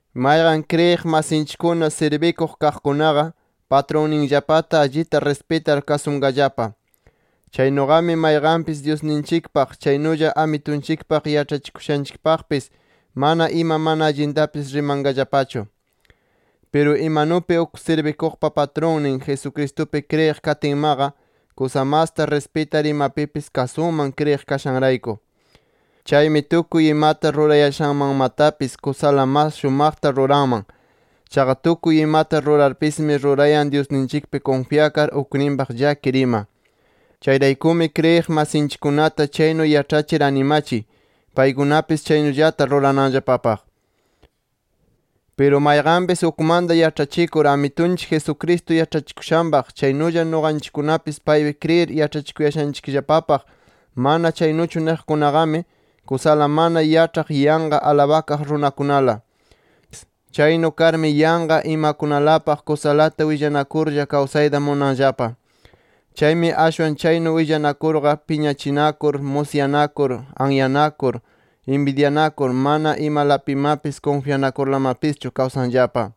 Mayqan kriyiq masinchikkuna sirbikuq kaqkunaqa, patrunninllapataqa allita rispitar kasunqallapa. Chaynuqami mayqanpis Dyusninchikpaq, chaynulla Amitunchikpaq yaĉhachikushanchikpaqpis mana ima mana allintapis rimayanqallapachu. Piru imanupi uk sirbikuqpa patrunnin, Jesucristupi kriyiq katinmaqa kusa masta rispitar imapipis kasunman kriyiq kashanrayku. Chaymi tukuy imata rurayashanmanmatapis kusala mas shumaqta ruranman. Chaqa tukuy imata rurarpismi rurayan Dyusninchikpi kunfyakar, ukninpaq llakir ima. Chayraykumi kriyiq masinchikkunata chaynu yaĉhachir animachiy paykunapis chaynullata rurananllapapaq. Piru mayqanpis ukmanta yaĉhachikur Amitunchik Jesucristo yaĉhachikushanpaq chaynulla nuqanchikkunapis paypi kriyir yaĉhachikuyashanchikllapapaq manami chaynuchu niqkunaqami, kusala mana yaĉhaq yanqa alabakaq runakunala. Chaynu karmi yanqa imakunalapaq kusalata willanakurlla kawsayta munanllapa. Chaymi ashwan chaynu willanakurqa, piñachinakur, musyanakur, anyanakur, inbidyanakur, mana imalapimapis kunfyanakurlamapischu kawsanllapa.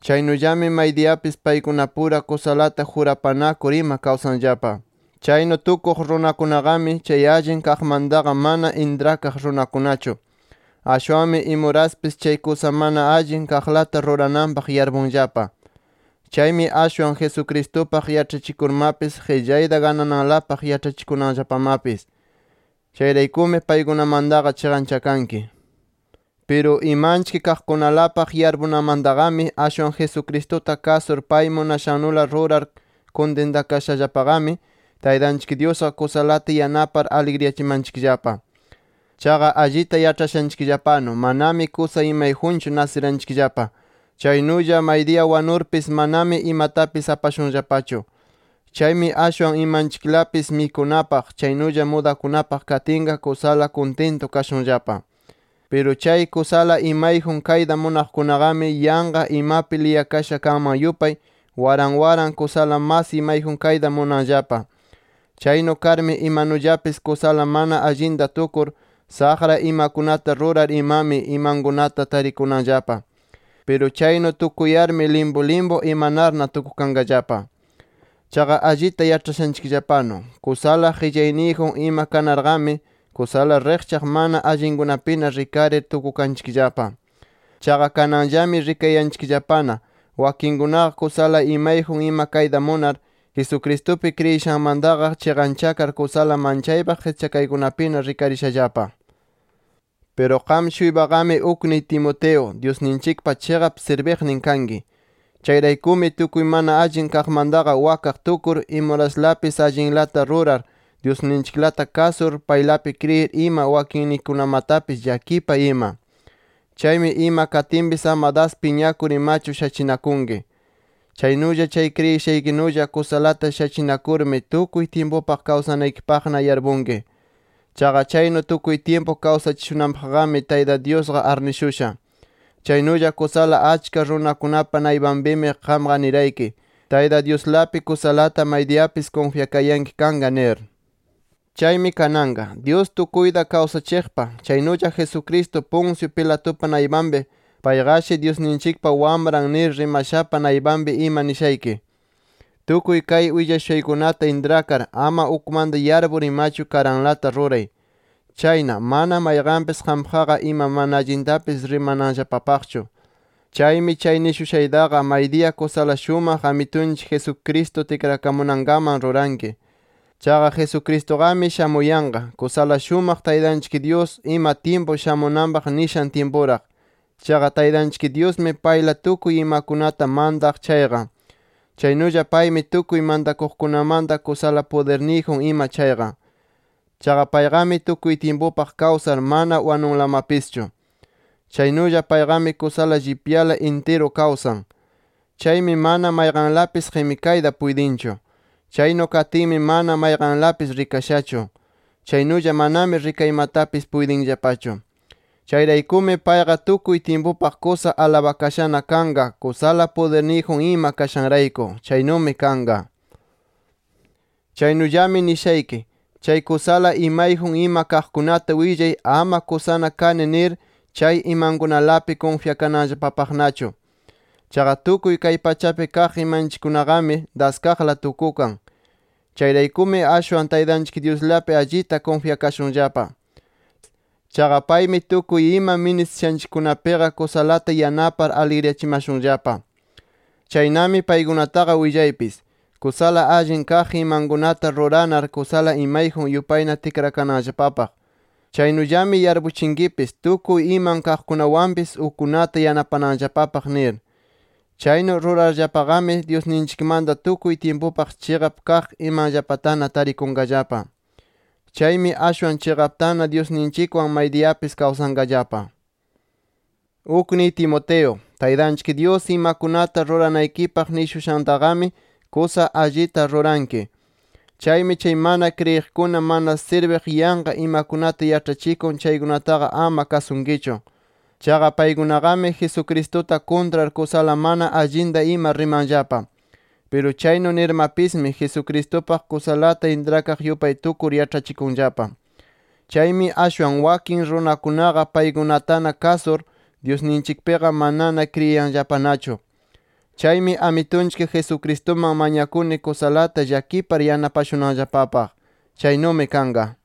Chaynullami maydiyapis paykunapura kusalata jurapanakur ima kawsanllapa. Chaynu tukuq runakunaqami chay allin kaqmantaqa mana intrakaq runakunachu. Ashwanmi imuraspis chay kusa mana allin kaqlata rurananpaq yarpunllapa. Chaymi ashwan Jesucristupaq yaĉhachikurmapis qillayta ganananlapaq yaĉhachikunanllapamapis. [Chayraykumi paykunamantaqa chiqanchakanki]. Piru imanchik kaqkunalapaq yarpunamantaqami ashwan Jesucristuta kasur pay munashannula rurar kuntintakashallapaqami, Taytanchik Dyusqa kusalata yanapar aligriyachimanchikllapa. Chaqa allita yaĉhashanchikllapanu, manami kusa imayjunchu nasiranchikllapa. Chaynulla maydiya wanurpis manami imatapis apashunllapachu. Chaymi ashwan imanchiklapis mikunapaq, chaynulla mudakunapaq katinqa kusala kuntintu kashunllapa. Piru chay kusala imayjun kayta munaqkunaqami yanqa imapi liyakasha kanman yupay waran waran kusala mas imayjun kayta munanllapa. Chaynu karmi imanullapis kusala mana allinta tukur, saqra imakunata rurar imami imankunata tarikunanllapa. Piru chaynu tukuyarmi limpu limpu imanarna tukukanllapa. Chaqa allita yaĉhashanchikllapanu kusala qillayniyjun ima kanarqami kusala riqchaq mana allinkunapina rikarir tukukanchikllapa. Chaqa kananllami rikayanchikllapana wakinkunaqa kusala imayjun ima kayta munar, Jesucristupi kriyishanmantaqa chiqanchakar kusala manchaypaq qischakaykunapina rikarishallapa. Piru qam-shuypaqami ukniy Timoteo Dyusninchikpa chiqap sirbiqnin kanki. Chayraykumi tukuy mana allin kaqmantaqa wakaq tukur, imuraslapis allinlata rurar, Dyusninchiklata kasur, paylapi kriyir ima wakinnikikunamatapis llakipay ima. Chaymi ima katinpis ama das piñakur imachu shachinakunki. Chaynulla chay kriyishaykinulla kusalata shachinakurmi tukuy tyimpupaq kawsanaykipaqna yarpunki. Chaqa chaynu tukuy tyimpu kawsachishunanpaqmi Tayta Dyusqa arnishusha. Chaynulla kusala achka runakunapa naypanpimi qamqa nirayki, Tayta Dyuslapi kusalata maydiyapis kunfyakayanki kanqa nir. Chaymi kananqa, Dyus tukuyta kawsachiqpa, chaynulla Jesucristo, Poncio Pilatupa naypanpi payqashi Dyusninchikpa Wamran nir rimashapa naypanpi ima nishayki: Tukuy kay willashushaykunata intrakar, ama ukmanta yarpur imachu, karanlata ruray. Chayna, mana mayqanpis qampaqqa ima mana allintapis rimananllapapaqchu. Chaymi chay nishushaytaqa maydiya kusala shumaq Amitunchik Jesucristo tikrakamunankaman ruranki. Chaqa Jesucristuqami shamuyanqa, kusala shumaq Taytanchik Dyus ima tyimpu shamunanpaq nishan tyimpuraq. Chaqa Taytanchik Dyusmi payla tukuy imakunata mantaq chayqa. Chaynulla paymi tukuy mantakuqkunamanta kusala pudirniyjun ima chayqa. Chaqa payqami tukuy tyimpupaq kawsar mana wanunlamapischu. Chaynulla payqami kusala llipya intirupi kawsan. Chaymi mana mayqanlapis qimikayta puytinchu. Chaynu katinmi mana mayqanlapis rikashachu. Chaynulla manami rikaymatapis puytinllapachu. ¡Chayraykumi payqa tukuy tyimpupaq kusa alabakashana kanqa kusala pudirniyjun ima kashanrayku! ¡Chaynumi kanqa! Chaynullami nishayki: Chay kusala imayjun ima kaqkunata willay ama kusana kani ima nir chay imankunalapi kunfyakananllapapaqnachu. Chaqa tukuy kay pachapi kaq imanchikkunaqami daskaqla tukukan. Chayraykumi ashwan Taytanchik Dyuslapi allita kunfyakashunllapa. Chaqa paymi tukuy ima ministishanchikkunapiqa kusalata yanapar aligriyachimashunllapa. Chaynami paykunataqa willaypis: Kusala allin kaq imakunata rurarna kusala imayjun yupayna tikrakananllapapaq. Chaynullami yarpuchinkipis tukuy iman kaqkunawanpis ukkunata yanapananllapapaq nir. Chaynu rurarllapaqami Dyusninchikmanta tukuy tyimpupaq chiqap kaq imanllapatana tarikunqallapa. Chaymi ashwan chiqaptana Dyusninchikwan maydiyapis kawsanqallapa. Ukniy Timoteo, Taytanchik Dyus imakunata ruranaykipaq nishushantaqami kusa allita ruranki. Chaymi chay mana kriyiqkuna mana sirbiq yanqa imakunata yaĉhachikun chaykunataqa ama kasunkichu. Chaqa paykunaqami Jesucristuta kuntrar kusala mana allinta ima rimanllapa. Piru chaynu nirmapismi Jesucristupaq kusalata intrakaq yupay tukur yaĉhachikunllapa. Chaymi ashwan wakin runakunaqa paykunatana kasur, Dyusninchikpiqa manana kriyinllapanachu. Chaymi Amitunchik Jesucristuman mañakuni kusalata llakipar yanapashunanllapapaq. Chaynumi kanqa.